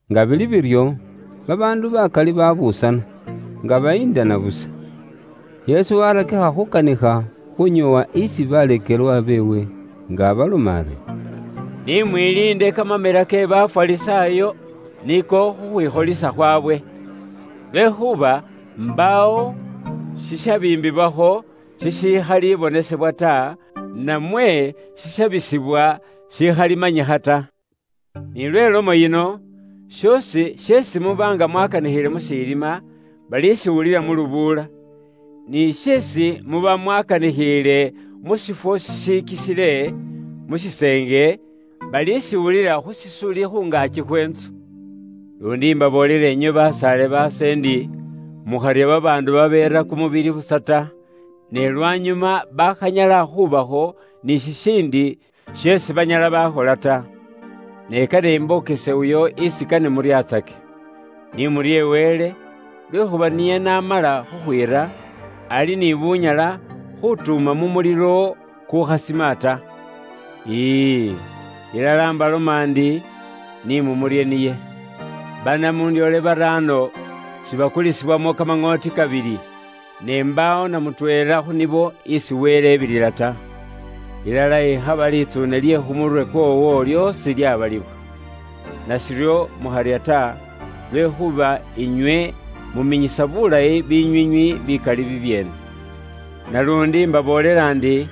Nga bili biryo, babaandu bakali babuusana, nga bayindana busa. Yesu warakikha khukanikha, khunyoowa isi baleekelwa beewe, nga abaloma ari, “Ni mwiliinde kamamela ke Bafarisaayo, niko khukhwikholisa khwawe. Lwekhuuba mbaawo shishabiimbibwakho shishikhalibonesebwa ta, namwe shishabisibwa shikhalimanyikha ta. Ni lwe lomo yino, shoosi sheesi muba nga mwakaanikhiile mu shilima, balishiwulilila mu lubuula; ni sheesi muba mwakaanikhiile mu shifwo shishikisile, mu shiseenge, balishiwulilila khu shisuli khu ngaaki khwe ntsu. “Luundi mbaboolela inywe basaale baase ndi, mukharya babaandu babeera kumubili busa ta, ne lwanyuma bakhanyala khubakho ni shishiindi sheesi banyala bakhola ta. Ne kane imbokese uyo isi kane muryatsake: Ni murye Wele, lwekhuuba niye n'amala khukhwiira, ali ni bunyala khutuuma mu mulilo kukukhasima ta. Ii, ilala mbaloma ndi, ni mumurye niye. Banamundyoole baraano, sibakulisibwamo kamaŋooti kabili? Ne mbaawo na mutweela khu nibo, isi Wele ebilila ta. Ilala ikhaba litsuune lye khu murwe kwoowo lyoosi lyabaliwa. Nashiryo mukharya ta, lwekhuuba inywe muminyisa bulayi binywiinywi bikali bibyeene. “Naluundi mbaboolela ndi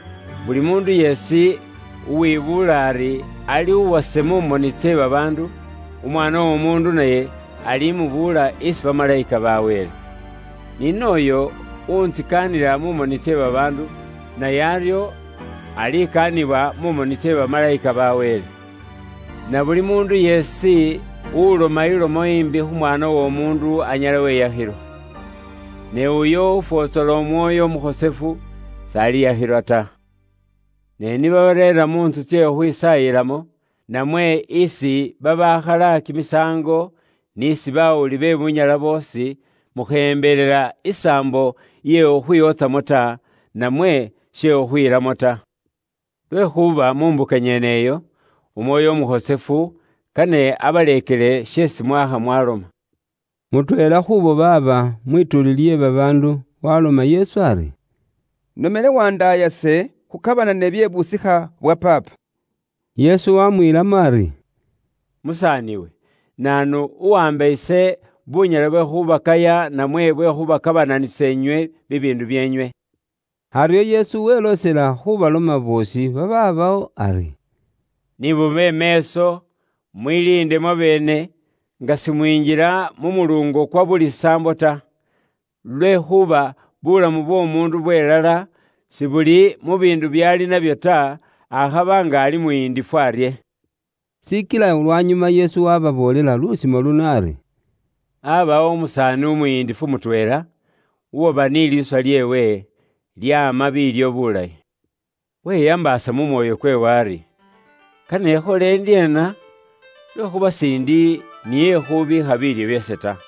buli muundu yeesi uwibuula ari ali uwase mu moni tse babaandu, Umwaana w'Omuundu naye alimubuula isi bamalayika ba Wele. Ni nooyo uwuntsikaanila mu moni tse baandu, naye aryo alikaanibwa mu moni tse bamalayika ba Wele. Na buli muundu yeesi uloma ilomo imbi khu Mwaana w'Omuundu anyala weyakhilwa. Ne uyo ufwotsola Umwoyo Umukhosefu, si bali mwiyashila bibyoonako byeewe ta. “Ne ni babareera mu ntsu tsye khukhwisaayilamo, namwe isi babaakhala kimisaango, n'isi bawuli be bunyala boosi, mukheyembelela isaambo iye khukhwiwotsamo ta, namwe she khukhwiilamo ta. Lwekhuuba mu mbuka nyeneyo, Umwoyo Umukhosefu, kane abaleekele sheesi mwakha mwaloma.” Mutweela khuubo baaba mwituuli lye babaandu waloma Yesu ari, “Inomele wandaayase khukabanane bye busikha bwa paapa.” Yesu wamwiilamo ari, “Musaaniwe, naanu uwaamba ise bunyaala bwe khubakaya namwe bwe khubakabananisa inywe bibiindu byeenywe?” Aryo Yesu weloosela khubaloma boosi babaabawo ari, “Ni mube meeso, mwiliinde mwabeene, nga simwinjila mu muluungo kwa buli saambo ta. Lwekhuuba buulamu bw'omuundu bwelala, sibuli mu biindu byaali nabyo ta, akhaba nga ali muyindifu arye!” Shikila lwanyuma Yesu waababoolela lusimo luno ari, “Aabawo umusaani umuyindifu mutweela, uwaba ni liiswa lyeewe, lyaama biilyo bulayi. Weyambaasa mu mwoyo kweewe ari, ‘Kane ikhole ndyeena? Lwekhuuba siindi ni ekhubiikha biilyo byase ta.’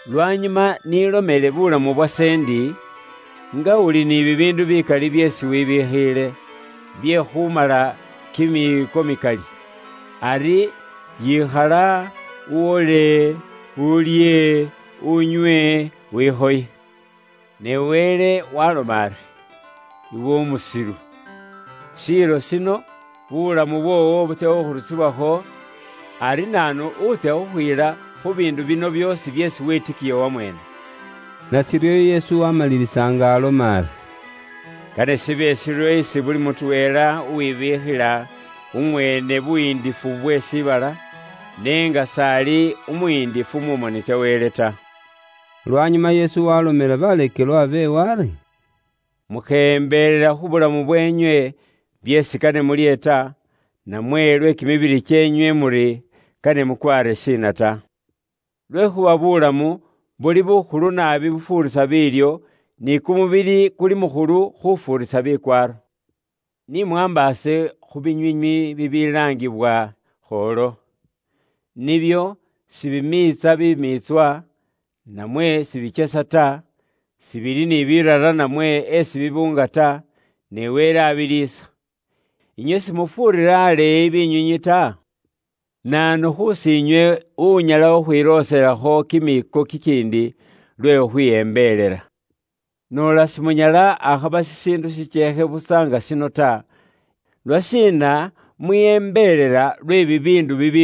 Lwanyuma ise nilomele mu mwoyo ndi; nga uli ni bibiindu bilayi bikali byeesi wibikhiile, bye khumala kimiiko mikali. Ari yikhala uwole, ulye, unywe, wikhoye!’ Ne Wele waaloma ari, ‘Iwe umusilu, shiilo shino, bulamu bwoowo butsya khukhurusibwakho, ari naanu wuutsya khukhwiila khu biindu bino byoosi byeesi wetikiya wamweene?’” Nashiryo Yesu wamalilisa nga aloma ari, “Kane shibe shiryo isi buli mutweela uwibiikhila umweene buyiindifu bwe shiibala, ne nga s'ali umuyindifu mu moni tsa Wele ta.” Lwanyuma Yesu waalomela baleekelwa beewe ari, “Mukheyembelela khu bulamu bweenywe byeesi kane mulye ta, namwe lwe kimibili kyeenywe muri kane mukwaare shiina ta. Lwekhuuba buulamu buli bukhulu naabi bufuurisa biilyo, ni kumubili kuli mukhulu khufuurisa bikwaaro. Ni mwaambaase khu binywiinywi bibilaangibwa khoolo. Nibyo sibimiitsa bimiitswa, namwe sibikyesa ta, sibili ni biirara namwe esi bibuunga ta, ne Wele abiliisa. Inywe simufuurira aleeyi binywiinywi ta? Naanu khusiinywe unyala khukhwilooselakho kimiiko kikiindi lwe khukhwiyembelela? Noola simunyala akhaba shishiindu shikyeekhe busa nga shino ta, lwashiina mwiyembelela lwe bibiindu bibiramile?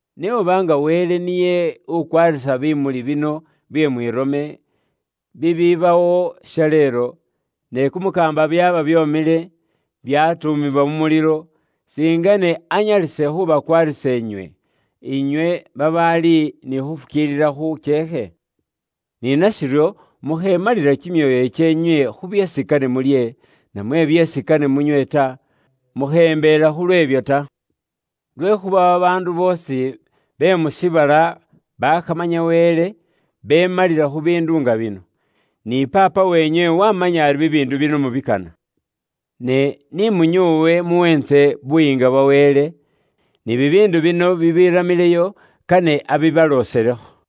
Ne oba nga Wele niye ukwaarisa bimuli bino bye mwirome, bibibawo shaleelo, ne kumukaamba byaaba byomile, byatuumibwa mu mulilo, singene anyalise khubakwaarisa inywe, inywe babaali ni khufukiilila khukyeekhe? “Ni nashiryo mukhemalila kimyoyo kyeenywe khu byeesi kane mulye, namwe byeesi kane munywe ta, mukheyembelela khu lweebyo ta. Lwekhuuba babaandu boosi be mu shiibala bakhamanya Wele, beemalila khu biindu nga bino, ni Paapa weenywe wamanya ari bibiindu bino mubikana. Ne ni munyoowe muweentse Buyiinga bwa Wele, ni bibiindu bino bibiramileyo kane abibalooselekho.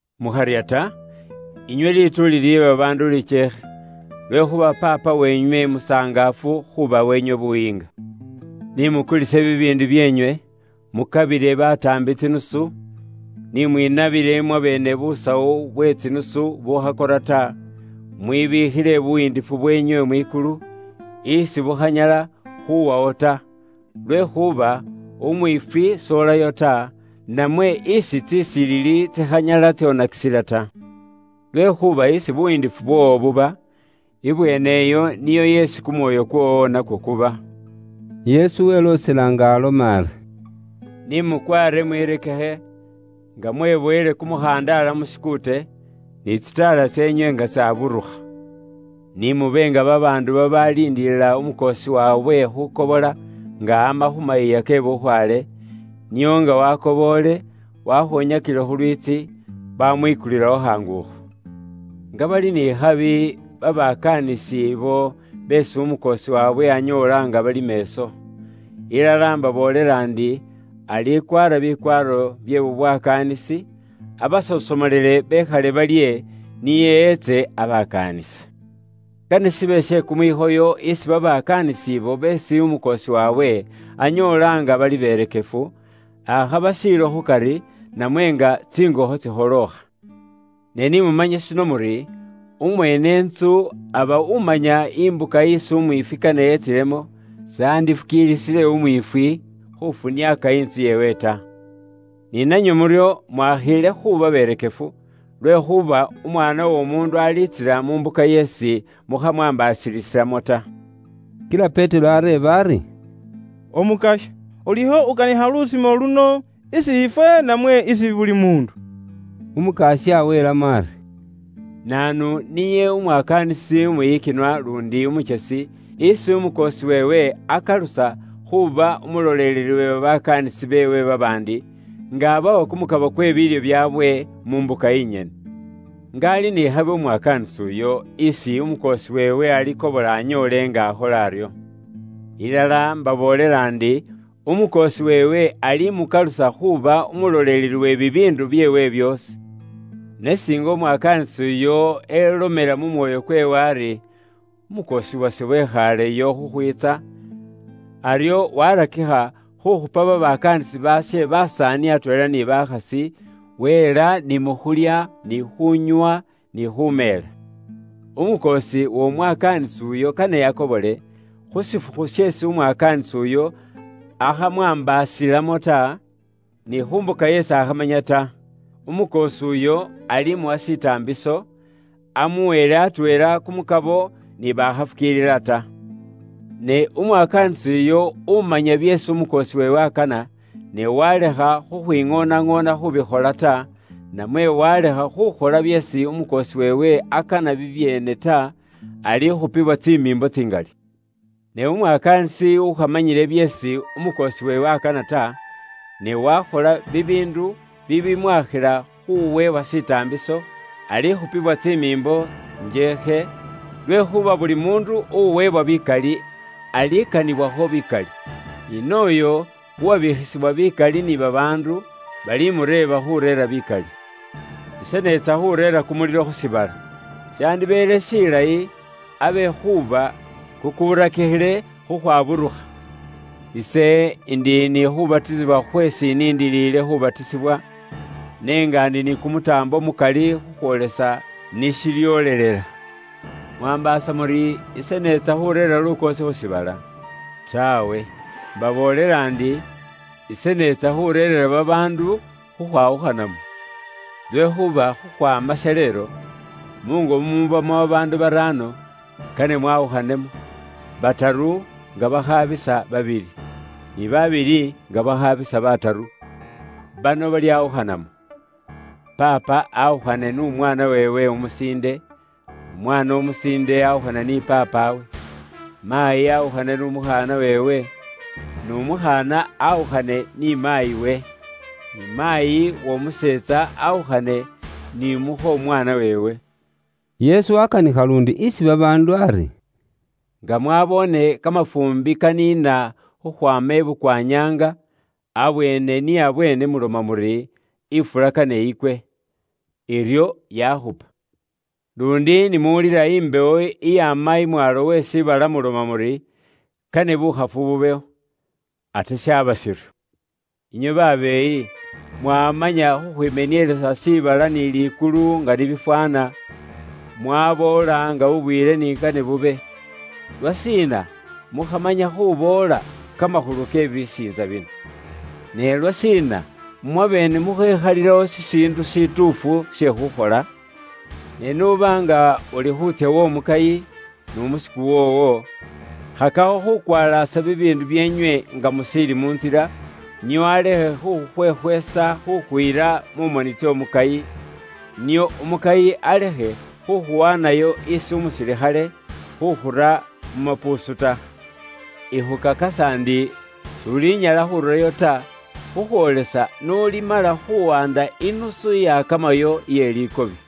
“Mukharya ta, inywe lituuli lye babaandu likyeekhe, lwekhuuba Paapa weenywe musangaafu khubawa inywe buyiinga. Ni mukulise bibiindu byeenywe, mukabile bataambi tsinusu, ni mwinabile mwabeene busawu bwe tsinusu bukhakora ta, mwibikhile buyiindifu bweenywe mwikulu, isi bukhanyala khuwawo ta. Lwekhuuba umwiifwi s'olayo ta, namwe isi tsisilili tsikhanyala tsonakisila ta. Lwekhuuba isi buyiindifu bwoowo buba, ibweeneyo niyo yeesi kumwoyo kwoowo nakwo kuba.” Yesu weloosela nga aloma ari: “Ni mukwaare mwirekekhe, nga mwebowele kumukhandaala mu shikuute, ni tsitaala tseenywe nga tsaburukha. Ni mube nga babaandu babaaliindilila umukoosi waabwe khukobola nga ama khu mayiiya ke bukhwaale, nio nga wakoboole, wakhonyakile khu lwiitsi, bamwikulilawo khaangukho. Nga bali ni khabi, babakaanisi ibo beesi umukoosi waabwe anyoola nga bali meeso! Ilala mbaboolela ndi alikwaara bikwaaro bye bubwakaanisi, abasosomolele bekhale balye, niye etse abakaanise. Kane shibe she kumwikhoyo isi babakaanisi ibo beesi umukoosi waabwe anyoola nga bali berekefu, akhaba shiilo khukari, namwe nga tsingokho tsikholookha. Ne ni mumanye shino muri, umweene ntsu aba umanya imbuka isi umwiifwi kane etsilemo, si yandifukiilisile umwiifwi khufuna intsu yeewe ta. Ni nanywe muryo mwakhiile khuuba berekefu, lwekhuuba Umwaana w'Omuundu alitsila mu mbuka yeesi mukhamwaambaasilisilamo ta.” Kila Petero areeba ari, “Umukasya, ulikho ukanikha lusimo luno, isi ifwe, namwe isi buli muundu?” Umukasya welamo ari, “Naanu niye umwakaanisi umwiyikinwa luundi umukyesi, isi umukoosi weewe akalusa khuuba umuloleleli we babakaanisi beewe babaandi, nga abawa kumukabo kwe biilyo byaabwe mu mbuka inyene? Nga ali ni khabi umwakaanisi uyo, isi umukoosi weewe alikobola anyoole nga akhola aryo! Ilala mbaboolela ndi, umukoosi weewe alimukalusa khuuba umuloleleli we bibiindu byeewe byoosi. Ne singa umwakaanisi uyo elomela mu mwoyo kweewe ari, ‘Umukoosi wase wekhaaleyo khukhwiitsa,’ aryo warakikha khukhupa babakaanisi baashe basaani atweela ni bakhasi, weela ni mu khulya, ni khuunywa, ni khumeela. Umukoosi w'omwakaanisi uyo kane akobole, khu shifukhu sheesi umwakaanisi uyo akhamwaambaasilamo ta, ni khu mbuka yeesi akhamanya ta. Umukoosi uyo alimuwa shitaambiso, amuweele atweela kumukabo ni bakhafukiilila ta. “Ne umwakaanisi uyo umanya byeesi umukoosi weewe akana, ne walekha khwiŋoonaŋoona khubikhola ta, namwe walekha khukhola byeesi umukoosi weewe akana bibyeene ta, alikhupiwa tsimiimbo tsingali. Ne umwakaanisi ukhamanyile byeesi umukoosi weewe akana ta, ne wakhola bibiindu bibimwakhila khuweebwa shitaambiso, alikhupiwa tsimiimbo njeekhe, lwekhuuba buli muundu uweebwa bikali alikanibwakho bikali, ni nooyo uwabikhisibwa bikali ni babaandu, balimureeba khureera bikali. “Ise neetsa khureera kumulilo khu shiibala, shandibeele shilayi abe kuba kukurakikhile khukhwaburukha! Ise indiyo ni khubatisibwa khweesi iniindiliile khubatisibwa, ne nga ndi ni kumutaambo mukali khukhwoolesa ni shilyoolelela. Mwaambaasa muri ise neetsa khureera lukoosi khu shiibala? Taawe! Mbaboolela ndi, ise neetsa khureerera babaandu khukhwawukhanamo. Lwekhuuba khukhwaama shaleelo, muungo mumubamo babaandu baraano, kane mwawukhanemo; bataru nga bakhabisa babili, ni babili nga bakhabisa bataru. Bano balyawukhanamo: paapa awukhane n'umwaana weewe umusiinde, n'umwaana musiinde awukhane ni paapawe. Maayi awukhane n'umukhaana weewe, n'umukhaana awukhane ni maayiwe. Ni maayi w'omuseetsa awukhane ni mukho mwaana weewe.” Yesu wakanikha luundi isi babaandu ari, “Nga mwaboone kamafuumbi kaniina khukhwaama ibukwa nyaanga, abweene ni abweene muloma muri, ‘Ifula kane ikwe.’ Iryo yaakhupa. Luundi ni muwulila imbewo iyaama imwaalo we shiibala muloma muri, ‘Kane bukhafu bubewo,’ ate shaaba shiryo. Inywe babeeyi, mwamanya khukhwimenielesa shiibala ni likulu nga ni bifwaana, mwaboola nga bubwiile ni kane bube. Lwashiina mukhamanya khuboola kamakhulu ke bisiintsa bino?” “Ne lwashiina mwabeene mukhekhalilawo shishiindu shituufu she khukhola? Ne n'uba nga uli khuutsya w'omukayi n'umusiku woowo, khakakho khuŋoona bibiindu byeenywe nga mushiili mu ntsila, nio alekhe khukhukhwekhwesa khukhuyila mu moni tsy'omukayi; nio umukayi alekhe khukhuwaanayo isi umusilikhale, khukhura mu mapuusu ta. Ikhukakasa ndi, s'ulinyala khururayo ta, khukhwoolesa n'ulimala khuwanda inusu iyakamayo iye likobi.”